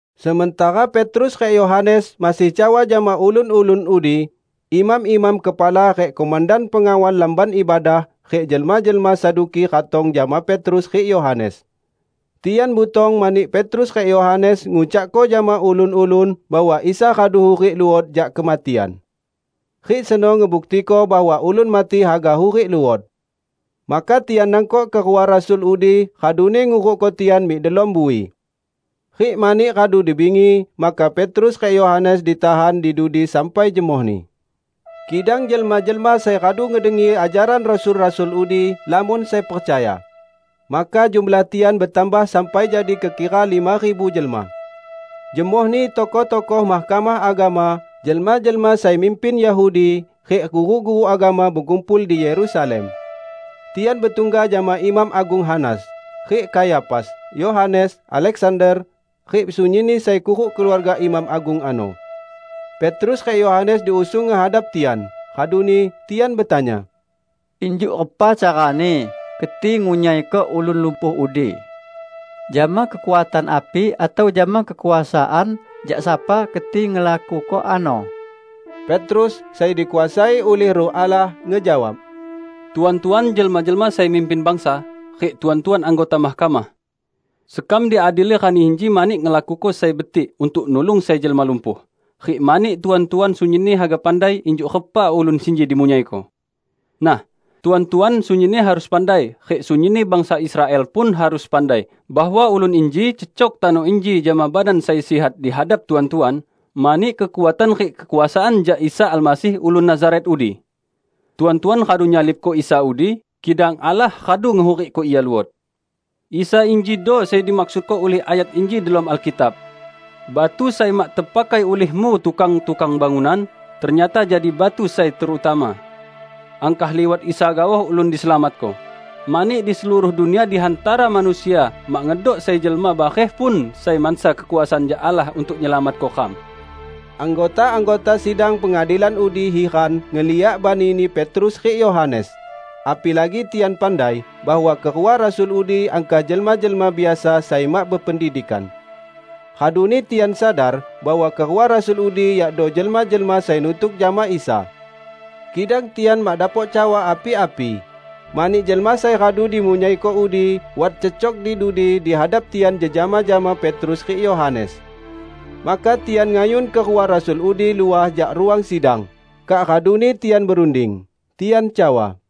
Sementara Petrus rik Yohanes masih cawa jama ulun-ulun udi, imam-imam kepala rik komandan pengawal Lamban Ibadah rik jelma-jelma Saduki ratong jama Petrus rik Yohanes. Tian butong mani Petrus rik Yohanes ngucakko jama ulun-ulun bahwa Isa radu hurik luot jak kematian. Rik seno ngebuktiko bahwa ulun mati haga hurik luot. Maka tian nangkok kerua rasul udi raduni ngurukko tian mik delom bui. Rik mani radu di bingi, maka Petrus rik Yohanes ditahan di dudi sampai jemohni. Kidang jelma-jelma sai radu ngedengi ajaran rasul-rasul udi, lamon sai percaya. Maka jumlah tian betambah sampai jadi kekira lima ribu jelma. Jemohni tokoh-tokoh Mahkamah Agama, jelma-jelma sai mimpin Yahudi rik guru-guru agama bekumpul di Yerusalem. Tian betungga jama Imam Agung Hanas, rik Kayafas, Yohanes, Aleksander, rik sunyinni sai kuruk keluarga imam agung ano. Petrus rik Yohanes diusung ngehadap tian, raduni tian betanya, "Injuk repa carani keti ngunyaiko ulun lumpuh udi? Jama kekuatan api atau jama kekuasaan jak sapa keti ngelakuko ano?" Petrus, sai dikuasai ulih Ruh Allah, ngejawab, "Tuan-tuan jelma-jelma sai mimpin bangsa rik Tuan-tuan anggota mahkamah! Sekam diadili rani inji mani ngelakuko sai betik untuk nulung sai jelma lumpuh, rik mani Tuan-tuan sunyinni haga pandai injuk repa ulun sinji dimunyaiko. Nah, Tuan-tuan sunyinni harus pandai rik sunyinni bangsa Israel pun harus pandai bahwa ulun inji cecok tano inji jama badan sai sihat dihadap Tuan-tuan, mani kekuatan rik kekuasaan jak Isa Almasih ulun Nazaret udi. Tuan-tuan radu nyalibko Isa udi, kidang Allah radu ngehurikko Ia luot. Isa injido sai dimaksudko ulih ayat inji delom Alkitab, 'Batu sai mak tepakai ulihmu tukang-tukang bangunan, ternyata jadi batu sai terutama.' Angkah liwat Isa gaoh ulun diselamatko. Mani di seluruh dunia di hantara manusia mak ngedok sai jelma bareh pun sai mansa kekuasaan jak Allah untuk nyelamatko ram." Anggota-anggota Sidang Pengadilan udi hiran ngeliak banini Petrus rik Yohanes, apilagi tian pandai bahwa kerua rasul udi angkah jelma-jelma biasa sai mak bependidikan. Raduni tian sadar bahwa kerua rasul udi yakdo jelma-jelma sai nutuk jama Isa. Kidang tian mak dapok cawa api-api, mani jelma sai radu dimunyaiko udi wat cecok di dudi di hadap tian jejama jama Petrus rik Yohanes. Maka tian ngayun kerua rasul udi luah jak ruang sidang, kak raduni tian berunding. Tian cawa,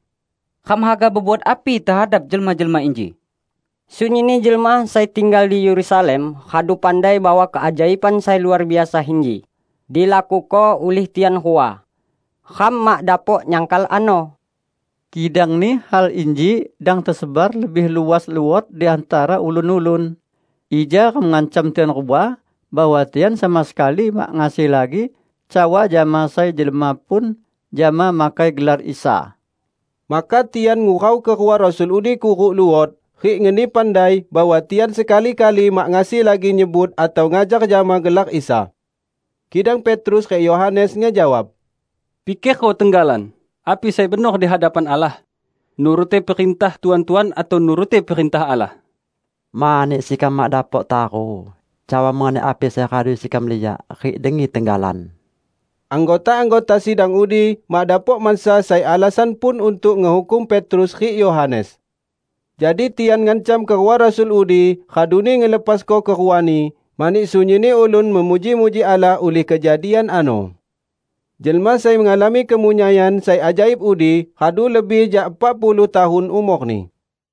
"Ram haga bebuat api tehadap jelma-jelma inji? Sunyinni jelma sai tinggal di Yerusalem radu pandai bahwa keajaiban sai luar biasa inji, dilakuko ulih tian rua. Ram mak dapok nyangkal ano. Kidang in hal inji dang tesebar lebih luas luot di hantara ulun-ulun, ija ram ngancam tian rua bahwa tian sama sekali mak ngasi lagi cawa jama sai jelma pun jama makai gelar Isa." Maka tian ngurau kerua rasul udi kuruk luot, rik ngeni pandai bahwa tian sekali-kali mak ngasi lagi nyebut atau ngajar jama gelar Isa. Kidang Petrus rik Yohanes ngejawab, "Pikerko tenggalan api sai benor di hadapan Allah: nuruti perintah Tuan-tuan atau nuruti perintah Allah. Mani sekam mak dapok taru cawa mengenai api sai radu sekam liak rik dengi tenggalan." Anggota-anggota sidang udi mak dapok mansa sai alasan pun untuk ngehukum Petrus rik Yohanes. Jadi tian ngancam kerua rasul udi, raduni ngelepasko keruani, mani sunyinni ulun memuji-muji Allah ulih kejadian ano. Jelma sai ngalami kemunyaian sai ajaib udi radu lebih jak epak puluh tahun umorni.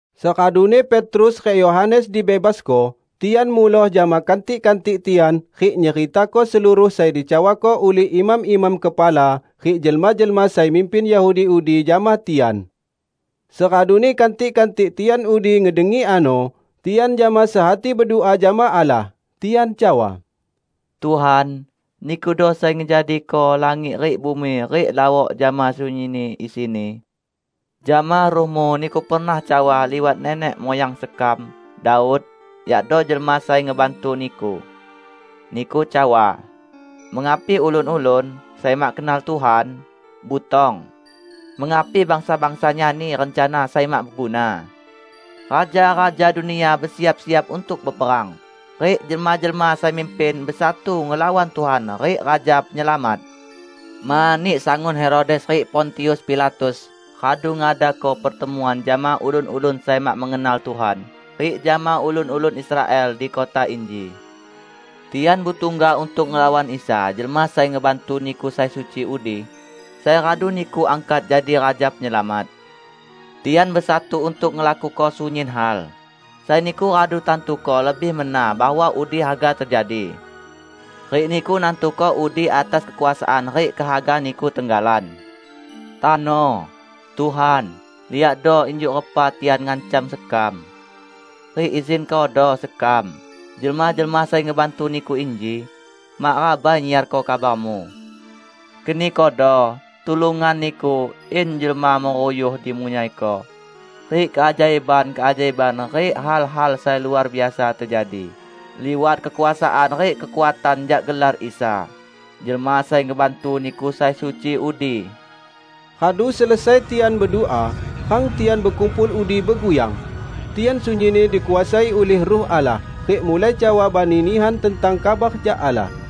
Seraduni Petrus rik Yohanes dibebasko, tian muloh jama kantik-kantik tian rik nyeritako seluruh sai dicawako ulih imam-imam kepala rik jelma-jelma sai mimpin Yahudi udi jama tian. Seraduni kantik-kantik tian udi ngedengi ano, tian jama sehati bedua jama Allah. Tian cawa, "Tuhan, Nikudo sai ngejadiko langit rik bumi rik lawok jama sunyinni isini. Jama Ruh-Mu Niku pernah cawa liwat nenek muyang sekam, Daud, yakdo jelma sai ngebantu Niku; Niku cawa, 'Mengapi ulun-ulun, sai mak kenal Tuhan, butong; mengapi bangsa-bangsa nyani rencana sai mak beguna? Raja-raja dunia besiap-siap untuk beperang, rik jelma-jelma sai mimpin besatu ngelawan Tuhan rik Raja Penyelamat!' Mani sangun Herodes rik Pontius Pilatus radu ngadako pertemuan jama ulun-ulun sai mak mengenal Tuhan rik jama ulun-ulun Israel di kota inji. Tian betungga untuk ngelawan Isa Jelma Sai Ngebantu Niku sai suci udi, sai radu Niku angkat jadi Raja Penyelamat. Tian besatu untuk ngelakuko sunyin hal, sai Niku radu tantuko lebih mena bahwa udi haga tejadi. Rik Niku nantuko udi atas kekuasaan rik kehaga Niku tenggalan. Tano, Tuhan, liakdo injuk repa tian ngancam sekam. Rik izinkodo sekam, jelma-jelma sai ngebantu Niku inji, mak rabai nyiarko kabar-Mu. Kenikodo tulungan Niku in jelma meruyuh dimunyaiko rik keajaiban-keajaiban rik hal-hal sai luar biasa tejadi liwat kekuasaan rik kekuatan jak gelar Isa, Jelma Sai Ngebantu Niku sai suci udi." Radu selesai tian bedua, rang tian bekumpul udi beguyang. Tian sunyinni dikuasai ulih Ruh Allah, rik mulai cawa bani nihan tentang kabar jak Allah.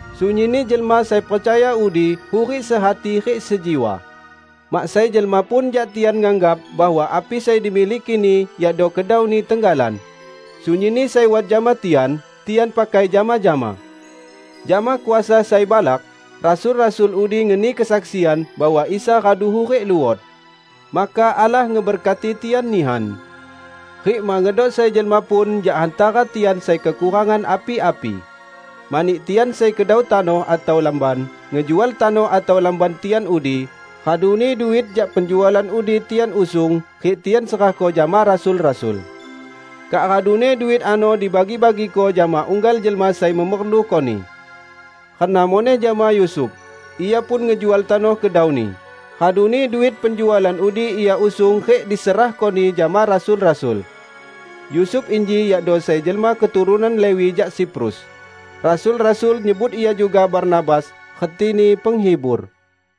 Sunyinni jelma sai percaya udi hurik sehati rik sejiwa. Mak sai jelma pun jak tian nganggap bahwa api sai dimilikini yakdo kedauni tenggalan. Sunyinni sai wat jama tian, tian pakai jama-jama. Jama kuasa sai balak, rasul-rasul udi ngeni kesaksian bahwa Isa radu hurik luot. Maka Allah ngeberkati tian nihan. Rik mak ngedok sai jelma pun jak hantara tian sai kekurangan api-api. Mani tian sai sekedau tanoh atau lamban, ngejual tanoh atau lamban tian udi; raduni duit jak penjualan udi tian usung rik tian serahko jama rasul-rasul. Kak raduni duit ano dibagi-bagiko jama unggal jelma sai memerlukoni. Reno muneh jama Yusuf. Ia pun ngejual tanoh kedauni, raduni duit penjualan udi ia usung rik diserahkoni jama rasul-rasul. Yusuf inji yakdo sai jelma keturunan Lewi jak Siprus; rasul-rasul nyebut ia juga Barnabas (retini Penghibur).